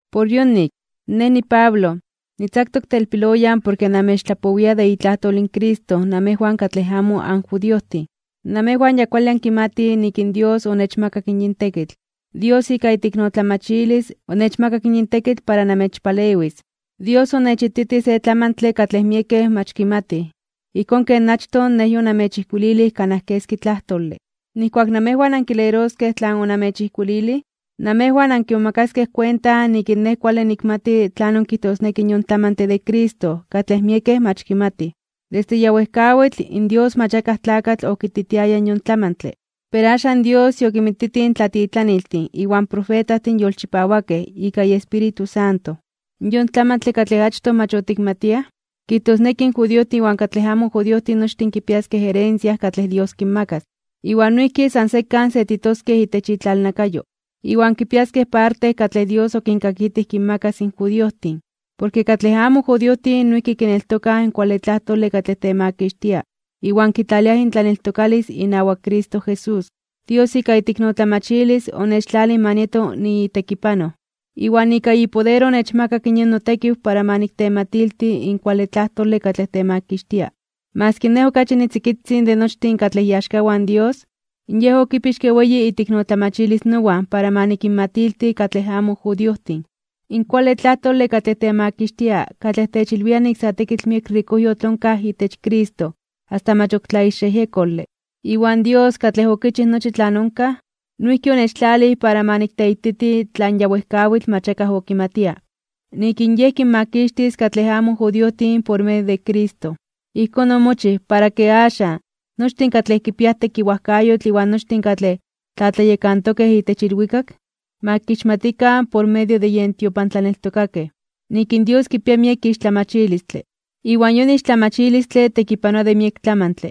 Por yonik, nej niPablo, nitzaktok telpiloyan porke namechtlapowia de itlajtol in Cristo namejwan katlej amo anjudiojtin. Namejwan ya kuale ankimatij nik in Dios onechmakak yin tekitl. Dios ika iteiknotlamachilis, onechmakak yin tekitl para namechpalewis. Dios onechititij se tlamantle katlej miekej mach kimatij, ijkón ken achtoj nej yonamechijkuililij kanaj keski tlajtole. Nijkuak namejwan ankileroskej tlan onamechijkuililij, namejwan ankimomakaskej kuenta nik in nej kuale nikmati tlanon kijtosneki in yon tlamantle de Cristo katlej miekej mach kimatij. Desde ya wejkawitl, in Dios mach akaj tlakatl okititiaya in yon tlamantle, pero axan Dios yokinmititij in tlatitlaniltin iwan profetajtin yolchipawakej ika iEspíritu Santo. Yon tlamantle katlej achtoj mach otikmatiaj, kijtosneki in judiojtin iwan katlej amo judiojtin nochtin kipiaskej herencia katlej Dios kinmakas. Iwan noijki san sekan setitoskej itech itlalnakayo. Iwan kipiaskej parte katlej Dios okinkakitij kinmakas in judiojtin, porke katlej amo judiojtin noijki kineltokaj in kuale tlajtole katlej temakixtia iwan kitlaliaj intlaneltokalis inawak Cristo Jesús. Dios ika iteiknotlamachilis, onechtlalij ma nieto niitekipanoj. Iwan ika ipoder onechmakak yin notekiw para ma niktematilti in kuale tlajtole katlej temakixtia. Maski nej okachi nitzikitzin de nochtin katlej iaxkawan in Dios, Yej okipixke weyi iteiknotlamachilis nowan para ma nikinmatilti katlej amo judiojtin, in kuale tlajtole katlej temakixtia katlej techilwia nik sa tekitl miek rikojyotl onkaj itech Cristo asta mach ok tlaixyejyekole. Iwan Dios, katlej okichij nochi tlan onkaj, noijki onechtlalij para ma nikteititi tlan ya wejkawitl mach akaj okimatia, nik in Yej kinmakixtis katlej amo judiojtin por medio de Cristo. Ijkón omochij, para ken axan, nochtin katlej kipiaj tekiwajkayotl iwan nochtin katlej tlatlayekantokej itech ilwikak, ma kixmatikan por medio de yen tiopantlaneltokakej, nik in Dios kipia miek ixtlamachilistle. Iwan yon ixtlamachilistle tekipanoa de miek tlamantle.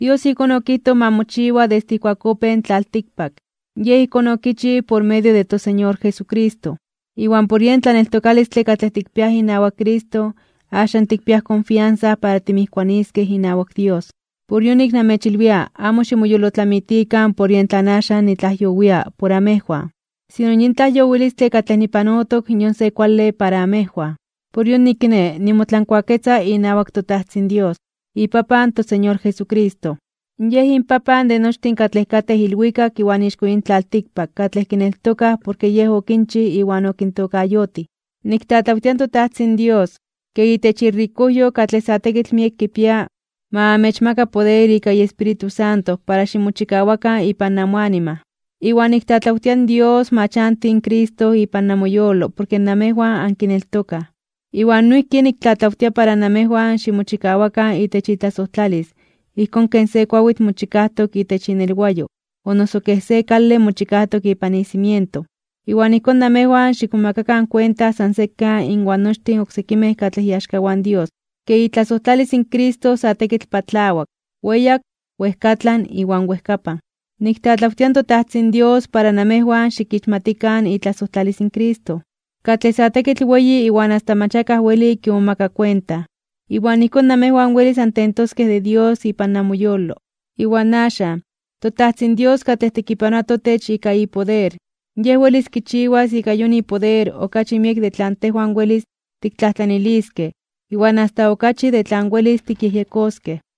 Dios ijkón okijtoj ma mochiwa desde ijkuak opéj in tlaltikpak. Yej ijkón okichij por medio de toSeñor Jesucristo. Iwan por yen totlaneltokalis katlej tikpiaj inawak Cristo axan tikpiaj konfiansa para timijkuaniskej inawak Dios. Por yonik, namechmolwilia, amo ximoyolotlamitikan por yen axan nitlajyowia por amejwan. Sino yin tlajyowilistle katlej nipanotok yon se kuale para amejwan. Por yonik kiné, nimotlankuaketza inawak toTajtzin Dios, iPapan in toSeñor Jesucristo. Yen inPapan de nochtin katlej katej ilwikak iwan ixko yin tlaltikpak katlej kineltokaj porke Yej okinchij iwan okintokayotij. Niktlatlawtia in toPapan Dios, ke itech irikojyo katlej sa tekitl miek kipia, ma amechmaka poder ika iEspíritu para ximochikawakan ipan namoanima. Iwan niktlatlawtia in Dios ma chanti in Cristo ipan namoyolo porke namejwan ankineltokaj. Iwan noijki niktlatlawtia para namejwan ximochikawakan itech itlasojtlalis ijkón ken se kuawitl mochikajtok itech inelwayo o noso kej se kale mochikajtok ipan icimiento. Iwan ijkón namejwan xikmomakakan kuenta san sekan inwan nochtin oksekimej katlej iaxkawan Dios, ke itlasojtlalis in Cristo sa tekitl patlawak, weyak, wejkatlan iwan wejkapan. Niktlatlawtia in toTajtzin Dios para namejwan xikixmatikan itlasojtlalis in Cristo, katlej sa tekitl weyi iwan asta mach akaj weli kimomaka kuenta. Iwan ijkón namejwan welis antentoskej de Dios ipan namoyolo. Iwan axan, toTajtzin Dios katlej tekipanoa totech ika ipoder, Yej welis kichiwas ika yon ipoder okachi miek de tlan tejwan welis tiktlajtlaniliskej iwan asta okachi de tlan welis tikyejyekoskej.